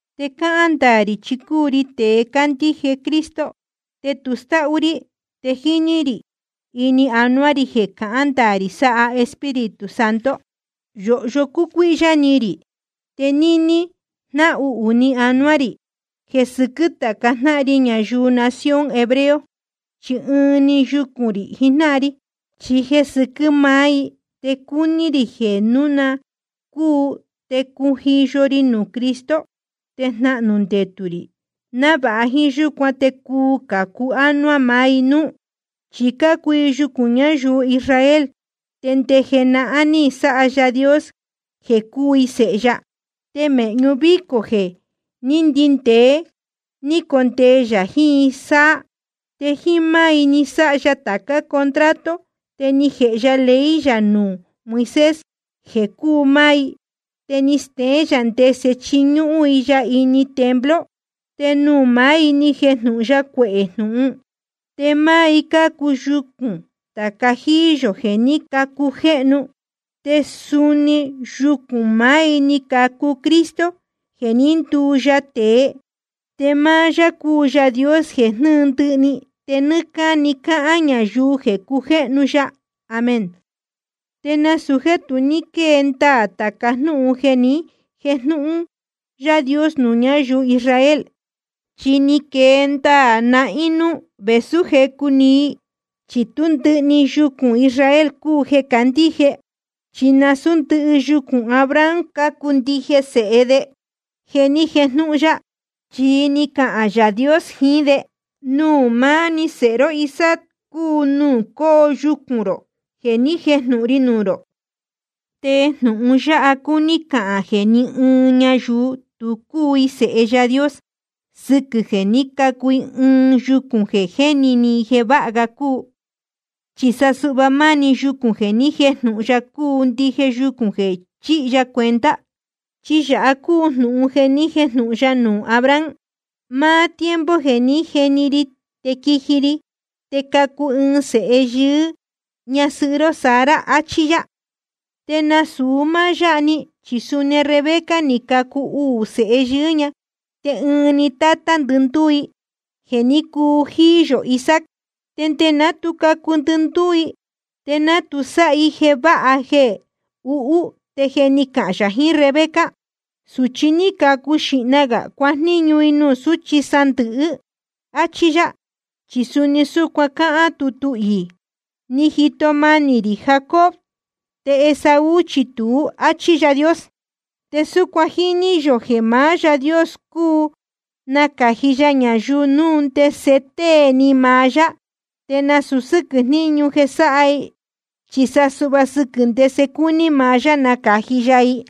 Te cáhán ndaā rī chi cúu ri tēe cándíje Cristo, te tu stáhú rí, te jíní rī ini anuá rī jeē cahán ndaā rī sáha Espíritu Santo. Yōhyo cúcuíhyá ni rī, te níní jnáhuhū ni anuá rī jeē sɨquɨ́ tāca jnáhan ri ñayuu nación hebreo, chi ɨɨn‑ni yucūn rī jijnáhan ri. Chi jeē sɨquɨ́ máá i te cúu ni rī jeē núu na cúu te cujiyo ri nuū Cristo te jnahnū ndetū rī, návāha jíín yúcuan te cuu cācu ánuá maá i núú. Chi cácuu i yucūn ñayuu Israel, te nde jenahán ni sáha Yaā Dios jeē cúu i sēhe ya, te mēhñu vícō jeē ndíndēé ní condee yā jiín i sáá. Te jíín máá i ni sáha ya tācá contrato, te ni jēhe ya ley yā nuū Moisés jeē cúu máá i, te ni steén yā ndese chiñúhún i ya ini templo, te nuū maá i ni jejnūhun ya cuehē jnūhun. Te máá i cácuu yucūn tāca jíí yō jeē ní cacujéhnu, te suni yucūn maá i ni cacu Cristo jeē ní nduu ya tēe. Te máá yá cúu Yaā Dios jeē jnɨ́ɨ ndɨhɨ‑ni, te nɨ́ɨ́ cáni cahān ñayuu jeē cujéhnu ya. Amén. Te nasūu jéē tu ní quée ndaā tāca jnúhun jeē ni jéjnūhun Yaā Dios nuū ñayuu Israel. Chi ni quee ndaā nahín núū vēsú jecu‑ni i, chi tú ndɨhɨ‑ni yucūn Israel cúu jeē cácandíje. Chi nasūú ndɨhɨ yucūn Abraham cácuu ndije sēhe de jeē ni jéjnūhun ya. Chi ni cahān Yaā Dios jiín de: Nuū maá‑ni sēhe ró Isaac cúu nuū coo yucūn rō jeē ni jéjnūhun ri nuū rō. Te jnūhun yáha cúní cahān jeē ni ɨɨn ñayuu tu cúu i sēhe Yaā Dios sɨquɨ̄ jeē ní cacu i ɨɨn yucūn jeē jéni ni i jeē váha ga cúu. Chi sa suhva máni yucūn jeē ni jéjnūhun ya cúu ndije yucūn jeē chíhi ya cuenta. Chi yāha cúu jnūhun jeē ni jéjnūhun ya nuū Abraham: Máá tiempo jeē ní jeni ri te quiji ri, te cacu ɨɨn sēhe yɨɨ́ ñasɨhɨ́ ró Sara, achí yá. Te nasūu máá yáha‑ni, chi suni Rebeca ni cacu uū sēhe yɨɨ́ ña, te ɨɨn‑ni tátá ndɨndúú i, jeē ní cuu jíí yō Isaac. Te nde ná tu cacu ndɨndúú i, te ná tu sáha i jeē váha jeē uhú, te je ni cahān yā jiín Rebeca: Sūchi ní cacu xīhna gā cuajníñu i nuū súchi sándɨ̄hɨ́, áchí yá. Chi suni súcuan cáhán tutu iī: Ni jito manī rī Jacob, te Esaú chi tuú, áchí Yaā Dios. Te súcuan jíní yō jeē maá Yaā Dios cuu nacāji ya ñayuu núu ndese tée ni maá yá, te nasūu sɨ́quɨ̄ jniñu jeē sáha i, chi sa suhva sɨquɨ̄ ndese cúní maá yá nacāji ya i.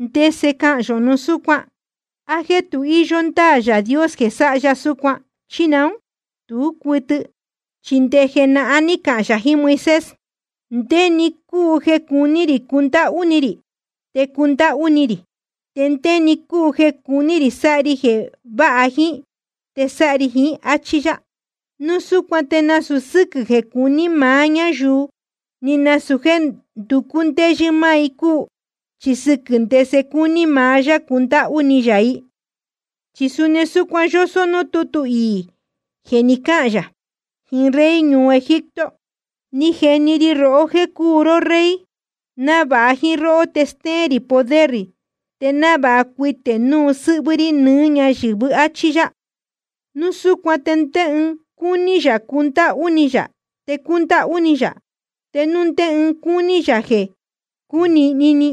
¿Ndese cahān yō núu súcuan? ¿A jéē tu íyó ndáā Yaā Dios jeē sáha ya súcuan, chí naún? Tú cuɨtɨ. Chi nde jenahán ní cahān yā jiín Moisés: Ndé‑ni cúu jeē cuní rī cundáhú ni rī, te cundáhú ni rī. Te ndé‑ni cúu jeē cuní rī sáha ri jeē váha jíín, te sáha ri jíín, áchí yá. Núu súcuan te nasūu sɨ́quɨ̄ jeē cuní maá ñáyuu, ni nasūu jéē nducú ndéyɨ́ máá i cúu, chi sɨquɨ̄ ndese cúní maá yá cundáhú ni yā i. Chi suni súcuan yósó núū tútu iī jeē ni cáhān yā jiín rey ñuu Egipto: Ni jeni ri rohó jéē cúu ró rey, návāha jíín róhó te stéén rī poder rī, te návāha cuitē núu sɨ́hvɨ́ rí nɨɨ́ ñáyɨ̄vɨ́, áchí yá. Núu súcuan te núu ndé ɨɨn cúní yā cundáhú ni yā, te cúndáhú ni yā. Te núu ndé ɨɨn cúní yā jeē cunīhni ni,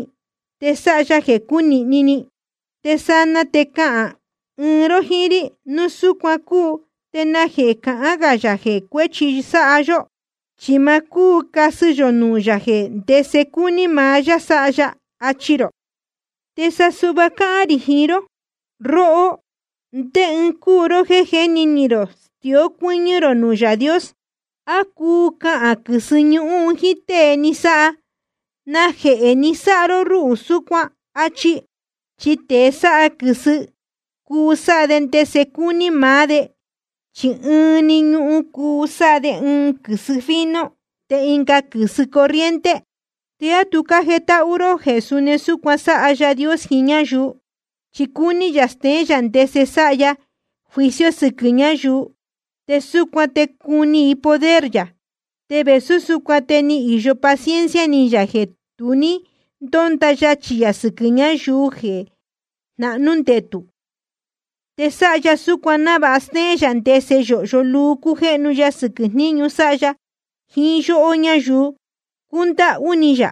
te sáha ya jeē cúnīhni ni. Te sanaa te cahān ɨɨn ró jíín rí: Núu súcuan cúu ¿te najehē cahán gā yā jeē cuēchi sáha yó? Chi ma cúu casɨ yō nuū yā jeē ndese cúní maá yá sáha ya. Achi rō. Te sa suhva cáhán rī jiín ró: Róhó, ¿ndé ɨɨn cúu ró jéē jéni ni rō stió cuɨ́ñɨ́ rō nuū Yaā Dios? ¿A cuu cahān quɨ̄sɨ ñuhun jíín tée ni sáha: Najehē ni sáha ró rúhū súcuan? achi. Chi tēe sáha quɨ̄sɨ, cuu sáha de ndese cúní maá de, chi ɨɨn‑ni ñuhun cuu sáha de ɨɨn quɨ̄sɨ fino te ɨnga quɨ̄sɨ corriente. ¿Te á tu jétáhú ró jeē suni súcuan sáha Yaā Dios jiín ñáyuu? Chi cúní yā steén yā ndese sáha ya juicio sɨquɨ̄ ñáyuu, te súcuan te cuni i poder yā. Te vēsú súcuan te ni īyo paciencia ni yā jeē tu ní ndónda yachī yā sɨquɨ̄ ñáyuu jeē jnahnú ndetū. Te sáha ya súcuan návāha stéén yā ndese yōhyo luu cújéhnu ya sɨquɨ̄ jniñu sáha ya jiín yóhó ñáyuu cúndáhú ni yā.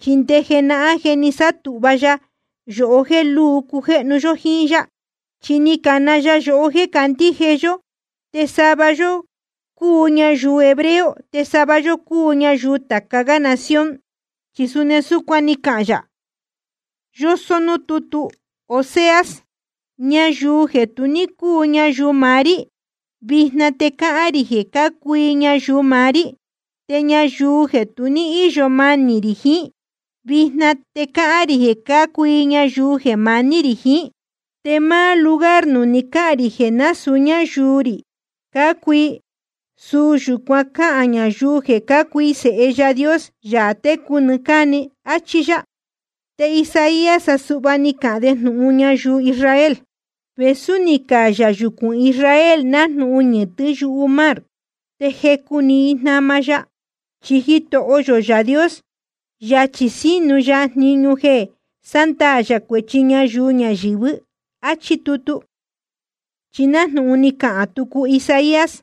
Chi nde jenahán je ni sátūhva ya yohó jéē luu cujéhnu yó jíín yá. Chi ni cana ya yohó jéē candíje yó, te sava yó cúu ñayuu hebreo te sava yó cúu ñayuu tāca gá nación. Chi suni súcuan ni cahān yā, yósó núū tútu Oseas: Ñayuu jeē tu ní cúu ñayuu maá rí, vijna te cahān rī jeē cácuu i ñayuu maá rí. Te ñayuu jeē tu ní íyo manī rī jiín, vijna te cahān rī jeē cácuu i ñayuu jeē maní rī jiín. Te máá lugar nuū ni cáhān rī jeē násūu ñáyuu rī cácuu i, suu yūcuan cáhān ñayuu jeē cácuu i sēhe Yaā Dios, Yaā técu nɨɨ́ cáni. Achí yá. Te Isaías sa suhva ni cahān de jnūhun ñayuu Israel: Vēsú ni cayā yucūn Israel nájnūhun ñɨ̄tɨ́ yumar, te jecu‑ni i jnama ya. Chi Jitoho yō Yaā Dios, yachī sínu ya jniñu jeē sándaā yā cuēchi ñayuu ñayɨ̄vɨ́. Achí tutu. Chi nájnūhun ni cahān tucu Isaías: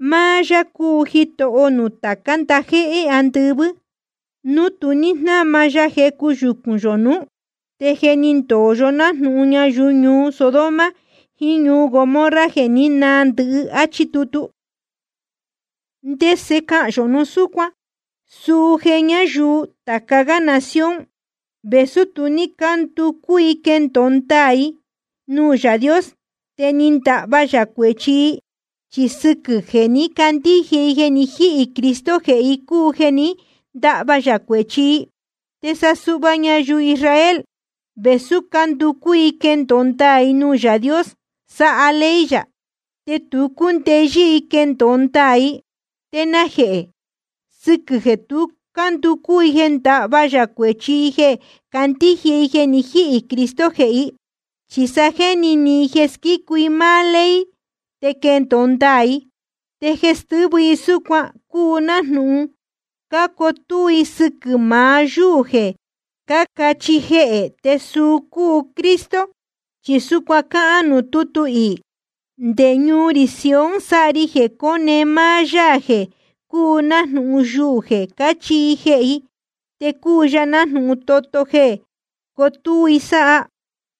Máá Yáā cúu Jitoho nuū tācá ndajéhé andɨvɨ́, núu tu ní jnáma ya jecu yucūn yō nuú, te je ni ndoho yó nájnūhun ñayuu ñuu Sodoma jiín ñuu Gomorra, jeē ní naa ndɨhɨ. Achí tutu. ¿Ndese cahān yō núu súcuan? Suu jeē ñáyuu tāca gá nación, vēsú tu ní cánducú i quendōo ndaā i nuū Yaā Dios, te ni ndahva yā cuēchi i. Chi sɨquɨ̄ jeē ní candíje i jeē ni jíhī Cristo jehē i cúu jeē ní ndahva yā cuēchi i. Te sa suhva ñayuu Israel, vēsú cánducú i quendōo ndaā i nuū Yaā Dios sáha ley yā, te tu cúndeyɨ́ i quendōo ndaā i. ¿Te najehē? Sɨquɨ̄ jeē tu cánducú i jeē ndahva yā cuēchi i jeē candíje i jeē ni jíhī Cristo jehē i, chi sa jéni ni i jeē squícu máá i ley te quendōo ndaā i. Te jeē stɨ́vɨ i súcuan cúu nájnūhun cácotúú i sɨquɨ̄ maá yúū jeē cácachihi jehē, te suu cúu Cristo. Chi súcuan cáhán nuū tútu iī: Nde ñuu rī Sion sáha ri jeē cóne maá Yaā jeē cúu nájnūhun yuū jeē cácachihi i jehē i. Te cúu ya nájnūhun toto jeē cotúú i sáha.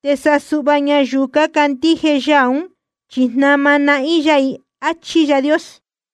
Te sa suhva ñayuu cácandíje Yaā ún, chi jnama nahín yá i. Achí Yaā Dios.